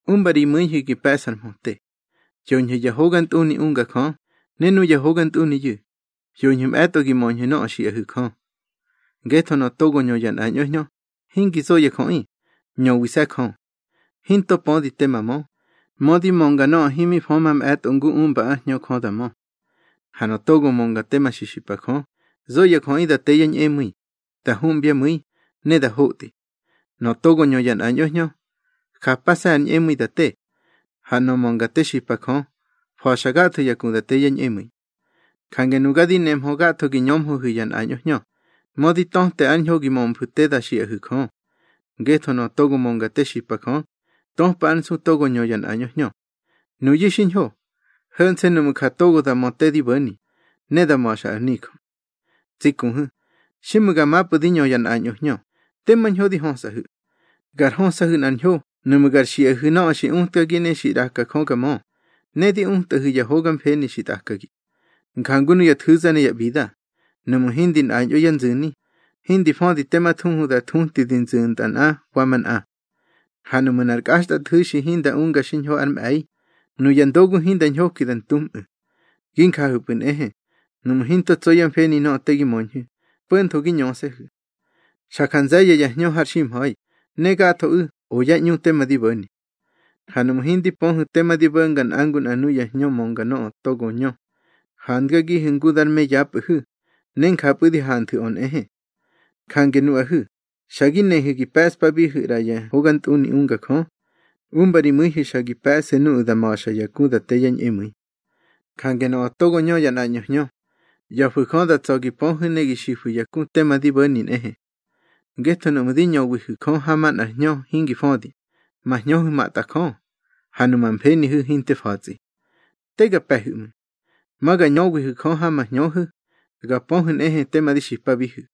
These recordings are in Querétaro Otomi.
Umba ri mu̱ihu̱ gi pe̱ꞌsu̱ ar mhöte. Hyoñhu̱ ya hogantꞌuni unga Jö, ne nuya hogantꞌuniyu̱, hyoñhu̱ mꞌe̱tꞌo gi möñhu̱ nöꞌö xiꞌahu̱ Jö. Ngetho nöꞌö togo ñö ya nꞌañꞌo hñö, hingi zo ya jöꞌi, ñöwise̱ Jö. Hinto pödi tema mö, mödi mönga nöꞌö himi fö mamꞌe̱tꞌo ngu umba ár Hñö Jö da mö. Ha nöꞌö togo mönga tema xipa Jö, zo ya jöꞌi da te yá ñꞌemu̱i, da humbyá mu̱i, ne da hotꞌi. Nöꞌö togo ñö ya nꞌañꞌo hñö, japase̱ ár ñꞌemu̱i da te. Ha nöꞌö mönga te xipa Jö, fa̱xa gatho ya ku da te yá ñꞌemu̱i. Jange nuga di nemhö gatho gi ñömhöhu̱ ya nꞌañꞌo hñö, mödi to̱te ár ñho gi mömfu̱ te da xiꞌahu̱ Jö. Ngetho nöꞌö togo mönga te xipa Jö, töpa ár nsu togo ñö ya nꞌañꞌo hñö. Nuyu̱ xiñho, ho̱nse̱ nuꞌmu̱ ja togo da mö tema di bo̱ni, ne da ma̱xa ar nijö. Tsi kuhu̱, xiꞌmu̱ ga mapꞌu̱ di ñö ya nꞌañꞌo hñö, tema ñho di hösꞌahu̱. Gar hösꞌahu̱ nꞌar ñho nuꞌmu̱ gar xiꞌahu̱ nöꞌö xi utkagi ne xi ꞌraka Jö ga mö, ne di utꞌahu̱ ya hoga mfeni xi tꞌakagi. Njangu nuya nthu̱za ne ya ꞌbida, nuꞌmu̱ hindi nꞌañꞌo yá nzu̱ni, hindi födi tema thuhu da thutꞌi di zu̱ntꞌa nꞌa wa manꞌa. Ha nuꞌmu̱ nꞌar kꞌaxtꞌathu̱xi hinda unga xiñho ár mꞌe̱i, nuya ndogu hinda ñhoki da ntunmꞌu̱. Gi njahu̱pꞌu̱ nꞌehe, nuꞌmu̱ hinto tso yá mfeni nöꞌö te gi möñhu̱, po̱ntho gi ñöse̱hu̱. Xa ja nze̱ye̱ ya hñö har ximha̱i, ne gathoꞌu̱ o yá ꞌñu tema di bo̱ni. Ha nuꞌmu̱ hindi pöhu̱ tema di bo̱nga nꞌa ngu nꞌa nuya hñö mönga nöꞌö togo ñö, handgagihu̱ ngu dar me yapꞌu̱hu̱, ne njapꞌu̱ di hanthu̱ꞌö nꞌehe. Jange nuꞌahu̱, xa gi nehu̱ gi pe̱ꞌspabihu̱ ꞌra ya hogantꞌuni unga Jö, umba ri mu̱ihu̱ xa gi pe̱ꞌsu̱ nuꞌu̱ da ma̱xa ya ku da te yá ñꞌemu̱i. Jange nöꞌö togo ñö ya nꞌañꞌo hñö, ꞌya̱fu̱ Jö da tsa̱ gi pöhu̱ ne gi xifu̱ ya ku tema di bo̱ni nꞌehe. Ngetho nuꞌmu̱ di ñöwihu̱ Jö ha manꞌar hñö hingi födi, ma hñöhu̱ matꞌajö, ha numa mfenihu̱ hinte fa̱tsꞌi. Te ga pe̱hu̱ ꞌmu̱. Ma ga ñöwihu̱ Jö ha ma hñöhu̱, ga pöhu̱ nꞌehe tema di xipabihu̱.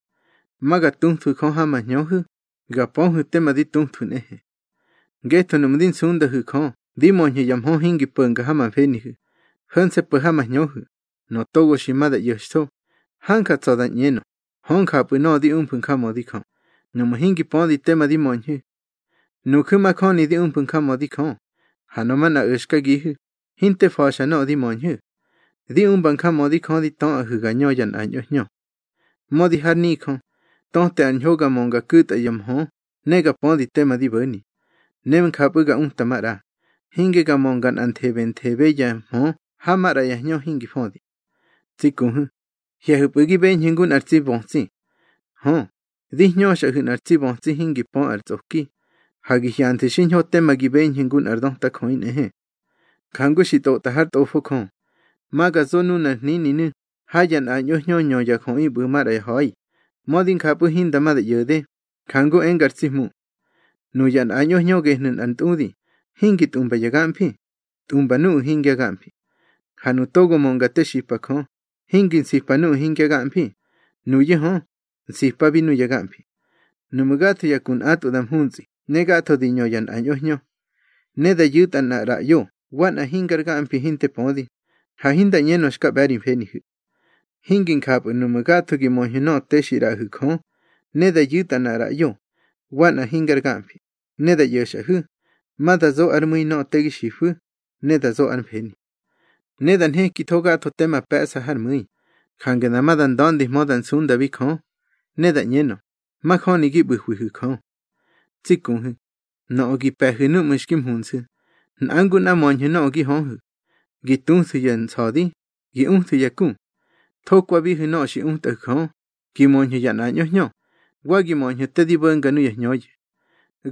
Ma ga tuthwu̱ Jö ha ma hñöhu̱, ga pöhu̱ tema di tuthwu̱ nꞌehe. Ngetho nuꞌmu̱ di nsundahu̱ Jö di möñhu̱ ya mhö hingi po̱nga ma mfenihu̱, ho̱nse̱ po̱ ha ma hñöhu̱, nöꞌö togo xi ma da ꞌyo̱xtho, hanja tsa̱ da ꞌñenö, hö njapꞌu̱ nöꞌö di umfu̱ njamödi Jö, nuꞌmu̱ hingi pödi tema di möñhu̱. Nuju̱ majöni di umfu̱ njamödi Jö, ha nöꞌö manꞌa o̱xkagihu̱, hinte fa̱xa nöꞌö di möñhu̱. Di umba njamödi Jö di töꞌahu̱ ga ñö ya nꞌañꞌo hñö. Mödi har nijö, töte ár ñho ga mönga ku̱tꞌa ya mhö ne ga pödi tema di bo̱ni, ne njapꞌu̱ ga uta maꞌra, hinge ga mönga nꞌanthebe ya nthebe ya mhö ha maꞌra ya hñö hingi födi. Tsi kuhu̱, hye̱hu̱pꞌu̱ gi beñhu̱ ngu nꞌar tsi bötsi. Hö, di hñöxꞌahu̱ nꞌar tsi bötsi hingi pö ar tsꞌoki, ha gi hyanthu̱ xiñho tema gi beñhu̱ ngu nꞌar döta jöꞌi nꞌehe. Jangu xi tꞌotꞌa hár Tꞌofo Jö: Ma ga zo nunar hnininu̱ ha ya nꞌañꞌo hñö ñö ya jöꞌi ꞌbu̱ maꞌra ya ha̱i, mödi njapꞌu̱ hinda ma da ꞌyo̱de, njanu̱ enga ar tsi Hmu. Nuya nꞌañꞌo hñö gehnu̱ nꞌar ntꞌudi, hingi tꞌumba ya gamfi, tꞌumba nuꞌu̱ hingya gamfi. Ha nuꞌu̱ togo mönga te xipa Jö, hingi nsipa nuꞌu̱ hingya gamfi; nuyu̱ hö, nsipabi nuya gamfi. Nuꞌmu̱ gatho ya ku nꞌatꞌwu̱ da mhuntsꞌi ne gatho di ñö ya nꞌañꞌo hñö, ne da yu̱tꞌa nꞌar ꞌraꞌyo wa nꞌa hingar gamfi hinte pödi, ha hinda ꞌñenö xka ꞌbe̱ ri mfenihu̱. Hingi njapꞌu̱ nuꞌmu̱ gatho gi möñhu̱ nöꞌö te xi ꞌraꞌahu̱ Jö, ne da yu̱tꞌa nꞌar ꞌraꞌyo, wa nꞌa hingar gamfi, ne da ꞌyo̱xꞌahu̱, ma da zo ár mu̱i nöꞌö te gi xifu̱, ne da zo ár mfeni. Ne da nhekitho gatho tema pe̱ꞌsa hár mu̱i, jange dama da nda̱ndihmö da nsundabi Jö, ne da ꞌñenö, majöni gi ꞌbu̱hwihu̱ Jö. Tsi kuhu̱, nöꞌö gi pe̱hu̱ núꞌmu̱ xki mhunsu̱, nꞌa ngu nꞌa möñhu̱ nöꞌö gi höhu̱: gi tuthu̱ ya nsa̱di, gi uthu̱ ya ku. Thokwabihu̱ nöꞌö xi utꞌahu̱ Jö, gi möñhu̱ ya nꞌañꞌo hñö, wa gi möñhu̱ te di bo̱nga nuya hñöyu̱.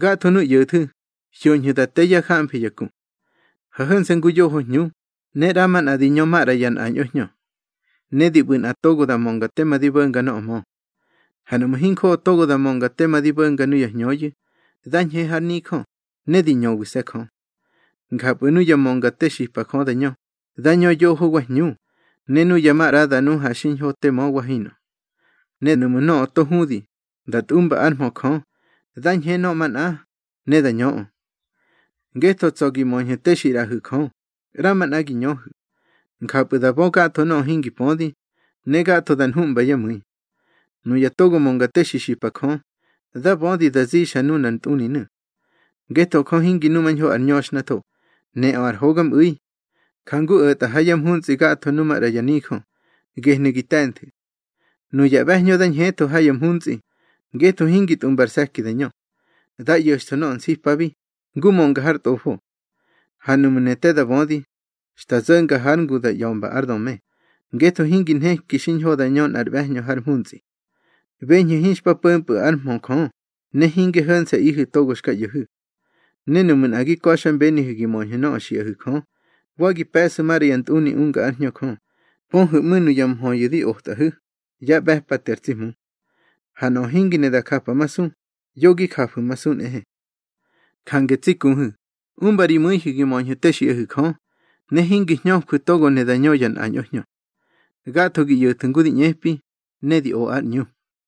Gathonu̱ ꞌyo̱thu̱, hyoñhu̱ da te yá jamfi ya ku. Ha ho̱nse̱ ngu yoho hñu, ne ꞌramanꞌa di ñö maꞌra ya nꞌañꞌo hñö, ne di ꞌbu̱ nꞌa togo da mönga tema di bo̱nga nöꞌö mö. Ha nuꞌmu̱ hinjoꞌo togo da mönga tema di bo̱nga nuya hñöyu̱, dá ñhe har nijö, ne di ñöwise̱ Jö. Njapꞌu̱ nuya mönga te xipa Jö da ñö, dá ñö yoho wa hñu, ne nuya maꞌra da nu ha xiñho te mö wa hinꞌö. Ne nuꞌmu̱ nöꞌö to hudi, da tꞌumba ár mhö Jö, dá ñhe nöꞌö manꞌa, ne da ñöꞌö. Ngetho tsa̱ gi möñhu̱ te xi ꞌraꞌahu̱ Jö, ꞌramanꞌa gi ñöhu̱. Njapꞌu̱ da bö gatho nöꞌö hingi pödi, ne gatho da nhuꞌmba yá mu̱i. Nuya togo mönga te xi xipa Jö, dá bödi da zixa nunar ntꞌuninu̱. Ngetho Jö hingi numañho ar ñöxhnatho, neꞌö ar hogamꞌu̱i. Jangu o̱tꞌa ha ya mhuntsꞌi gatho nu maꞌra ya nijö, gehnu̱ gi te̱nthu̱. Nuya ꞌbe̱hñö da ñhetho ha ya mhuntsꞌi, ngetho hingi tꞌumba ar se̱ki da ñö. Dá ꞌyo̱xtho nöꞌö nsipabi, ngu mönga har Tꞌofo. Ha nuꞌmu̱ ne te da bödi, xta zo̱nga hár ngu da ꞌya̱mba ár döme, ngetho hingi nheki xiñho da ñö nꞌar ꞌbe̱hñö har mhuntsꞌi. Beñhu̱ hinxpa po̱mpꞌu̱ ár mhö Jö, ne hingi ho̱nse̱ꞌihu̱ togo xka ꞌyo̱hu̱. Ne nuꞌmu̱ nꞌa gi ka̱xmbenihu̱ gi möñhu̱ nöꞌö xiꞌahu̱ Jö, wa gi pe̱ꞌsu̱ maꞌra ya ntꞌuni unga ár Hñö Jö, pöhu̱ ꞌmu̱ nuya mhöyu̱ di otꞌahu̱, yá ꞌbe̱pate ar tsi Hmu. Ha nöꞌö hingi ne da japamasu, yo gi jafu̱masu nꞌehe. Jange tsi kuhu̱, umba ri mu̱ihu̱ gi möñhu̱ te xiꞌahu̱ Jö, ne hingi hñöjwu̱ togo ne da ñö ya nꞌañꞌo hñö. Gatho gi ꞌyo̱thu̱ ngu di ꞌñepi, ne di o ár ꞌñu.